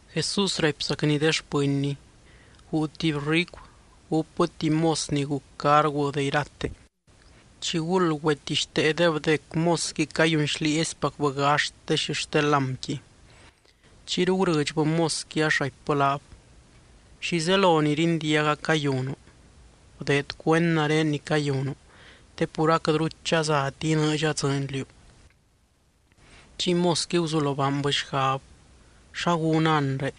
Jesús raipzacny de xpɨnny: —Guu tuby ricu gúpbɨ tuby mos ni guc cargu de irate, chiguld güetixteedeb dec mosqui cayunxlieezipacbɨ gaxt de xixte lámqui. Chiyru gurɨdxbɨ mosqui ax raipbɨ laab: “¿Xi zelo ni rindiaga cayunu? Bdeed cuend nare ni cayunu, te pur aquɨtru chazati inɨɨdxa dzɨɨny liú.” Chiy mosqui guzulo baanbɨ xgab: “¿Xa gúna anre?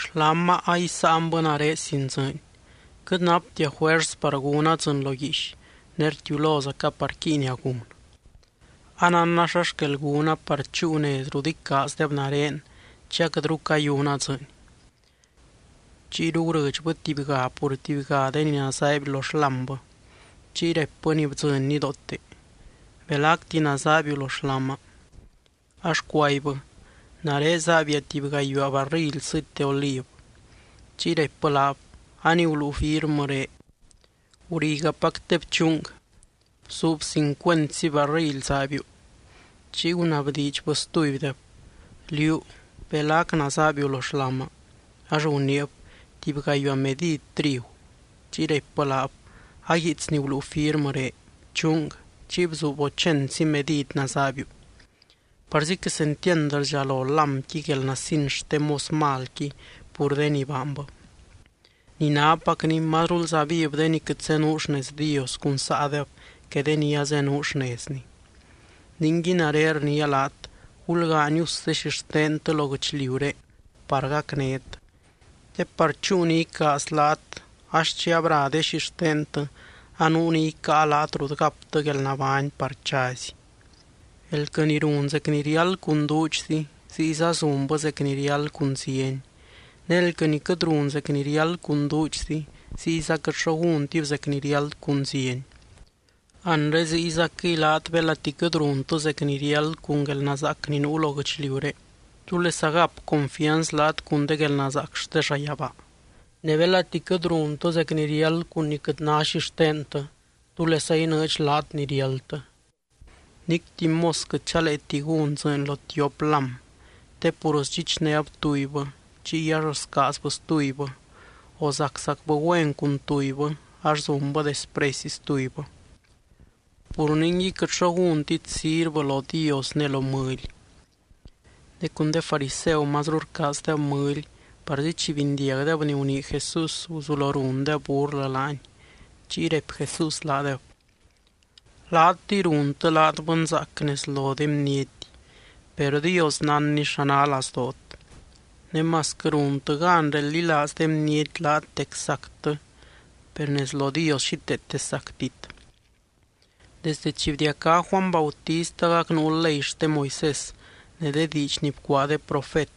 Xláma a isáanbɨ nare sin dzɨɨny. Quɨt naptia juers par gúna dzɨɨny lo guiix, ne rtiulozaca par quíinia gun. Anánna xa xquel gúna par chúu nez rut icaazdeb nare chi aquɨtru cayuna dzɨɨny.” Chiyru gurɨdxbɨ tubyga pur tubyga de ni nazaaiby lo xlámbɨ. Chiy raipbɨ ni bdzɨny nidoote: “¿Belacti nazaaibiu lo xláma?” Ax cuaibbɨ: “Nare zaaibia tuby gayuaa barrily sɨty de oliv.” Chiy raipbɨ laab: “A ni guluu firmɨré. Gurigapac te bchung. Bzuub cincuentzi barrily zaaibiu.” Chiy gunabdiidxbɨ stubydeb: “Liú, ¿belac nazaaibiu lo xláma?” Ax guniib: “Tuby gayuaa medid trigu.” Chiy raipbɨ laab: “A guiits ni guluu firmɨré. Bchung. Chiy bzuub ochentzi medid nazaaibiu.” Parzi quesentiand rdxalo lámqui guelnasin xte mos malqui pur de ni baanbɨ. Ni nápacni mazrulza viv de ni quɨt zenuu xnez Dios cun saadeb que de ni azenuu xnezny. ’Ningui nare rniia laat gulgaany us de xixtentɨ lo guɨchliuré par gacnét, te par chúu ni icaaz laat ax chi abra de xixtentɨ, anuu ni icáa laat rut gaptɨ guelnabány par chazy. ’Elquɨ ni run zec ni riáld cun duudxzi, ziyza zunbɨ zec ni riáld cun zieny. Ne elquɨ ni quɨt run zec ni riáld cun duudxzi ziyza quɨt xo gúntib zec ni riáld cun zieny. Anre ziygacquɨy laat belati quɨt runtɨ zec ni riáld cun guelnazaac ni nuu lo guɨchliuré, ¿túlesa gap confianz laat cun de guelnazaac xte llayabaa? Ne belati quɨt runtɨ zec ni riáld cun ni quɨt ná xixtentɨ, ¿túlesa inɨɨdx laat ni riáldtɨ? ’Nic tuby mos quɨt chaleeti gún dzɨɨny lo tiop lám. Te pur sdxichnéb tubybɨ, chiy ax scaazbɨ stubybɨ, o zaczacbɨ güen cun tubybɨ ax zunbɨ despresy stubybɨ. Pur ningui quɨt xo gúntit sirvɨ lo Dios ne lo mɨly. Ne cun de fariseu mazru rcaazdeb mɨly parzi chi bindiagdeb ni gunii Jesús, guzulo rundeb burlɨ laany. Chiy raipy Jesús laadeb: —Laatɨy runtɨ laat bɨnzaac nez lo de bniety, per Dios nánny xa ná lazdoot. Ne masquɨ runtɨ gan reldilaaz de bniety laat dec sactɨ, per nez lo Dios xíteete sactit. ’Desde chi bdiacá Juany Bautist agac nuu ley xte Moisés ne de diidx ni bcuaa de profet.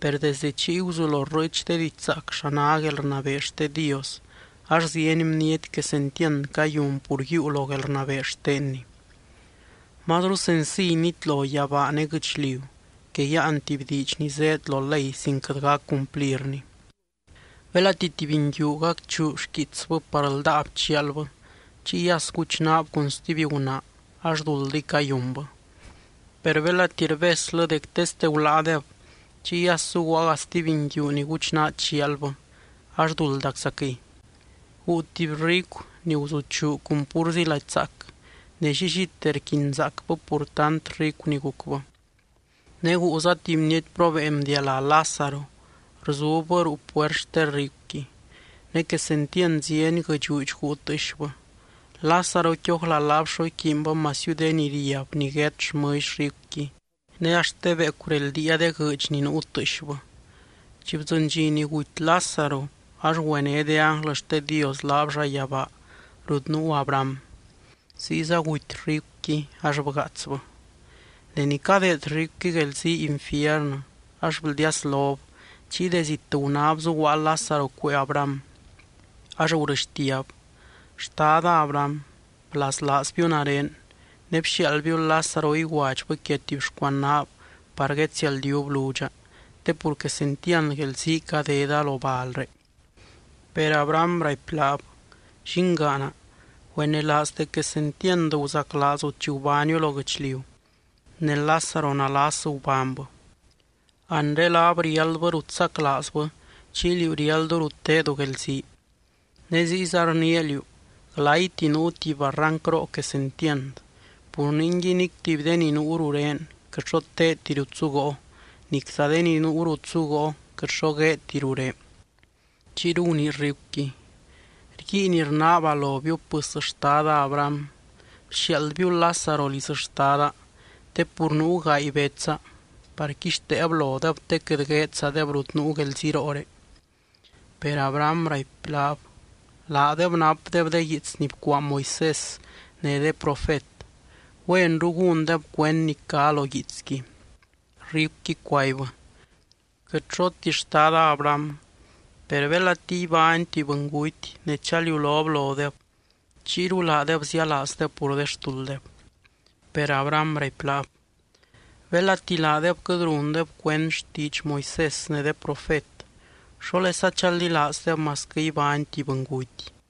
Per desdɨ chiy guzulo rrɨɨch de didxzaac xa ná guelrnabee xte Dios, ax zieny bniety quesentiand cayun pur yiiu lo guelrnabee xtenny. ’Mazru sensiy nitlo yabaa ne guɨchliu, que yáan tuby diidx ni zéed lo ley sin quɨt gac cumplirni. ’Belati tuby nguiu gacchuu xquiitsbɨ par ldáab chialbɨ, chiy as guchnaab cun stuby gunaa ax duldiy cayunbɨ. Per belati rbeslɨ dec teste guláadeb, chiy as zuguaaga stuby nguiu ni guchnaa chialbɨ, ax duldaczaquɨy. ’Guu tuby ricu, ni guzuchuu cun púrzi lady zaac, ne llillite rquinzaacbɨ pur tant ricu ni gucbɨ. Ne guuza tuby bniety probeen bdialá Lázaro, rzubbɨ ruu puert xte ricuqui. Ne quesentiand zieny guɨdxuudx guu tɨɨxbɨ. Lázaroqui ójla laab xo iquiinbɨ masiu de ni riab niguét xmɨlly ricuqui, ne axt de beecu reldiia de guɨɨdx ni nuu tɨɨxbɨ. Chi bdzɨny dxi ni guty Lázaro, ax güené de ánglɨ xte Dios laab llayabaa rut nuu Abraham. Ziyza guty ricuqui, ax bgaatsbɨ. Deni cadeed ricuqui guelzii infiernɨ ax bldiaslob, chiy de zit gunáb zuguaa Lázaro cuee Abraham. Ax gurɨxtiab: “Xtada Abraham, blaslaazbiu nare, ne bxiaaldbiu Lázaro iguadxbɨ quia tuby xcuanaab par guedsialdiub ludxa, te pur quesentiand guelzii cadeda lo balré.” Per Abraham raipy laab: “Llingaana, güenelaaz dec quesentiand guzaclaazu chi gubániu lo guɨchliu, ne Lázaro nalas gubánybɨ. Anre laab riáldbɨ rut saclaazbɨ chiy liú riáldu rut tedu guelzii. Ne ziyza rniia liú: glayti nuu tuby barrancroo quesentiand. Pur ningui nic tuby de ni nuu rurén quɨt xo teedti rut zugoo, nicza de ni nuu rut zugoo quɨt xo gueedti ruré.” Chiyru gunii ricuqui: “Rguiin rnaaba lobiu pɨs xtada Abraham, bxiaaldbiu Lázaro liz xtada te pur nuu gaay betsa, par quixteeb lodeb, te quɨt gueedzadeb rut nuu guelzirooré.” Per Abraham raipy laab: “Laadeb napdeb de guiits ni bcuaa Moisés ne de profet. ¡Güenru gúndeb cuend ni cá lo guiitsqui!” Ricuqui cuaibbɨ: “Quɨt xoti, xtada Abraham, per belati ibány tuby bɨnguty ne chaliulob lodeb chiyru laadeb zialaazdeb pur de xtulddeb.” Per Abraham raipy laab: “Belati laadeb quɨt rundeb cuend xtiidx Moisés ne de profet, ¿xólesa chaldilaazdeb masquɨ ibány tuby bɨnguty?”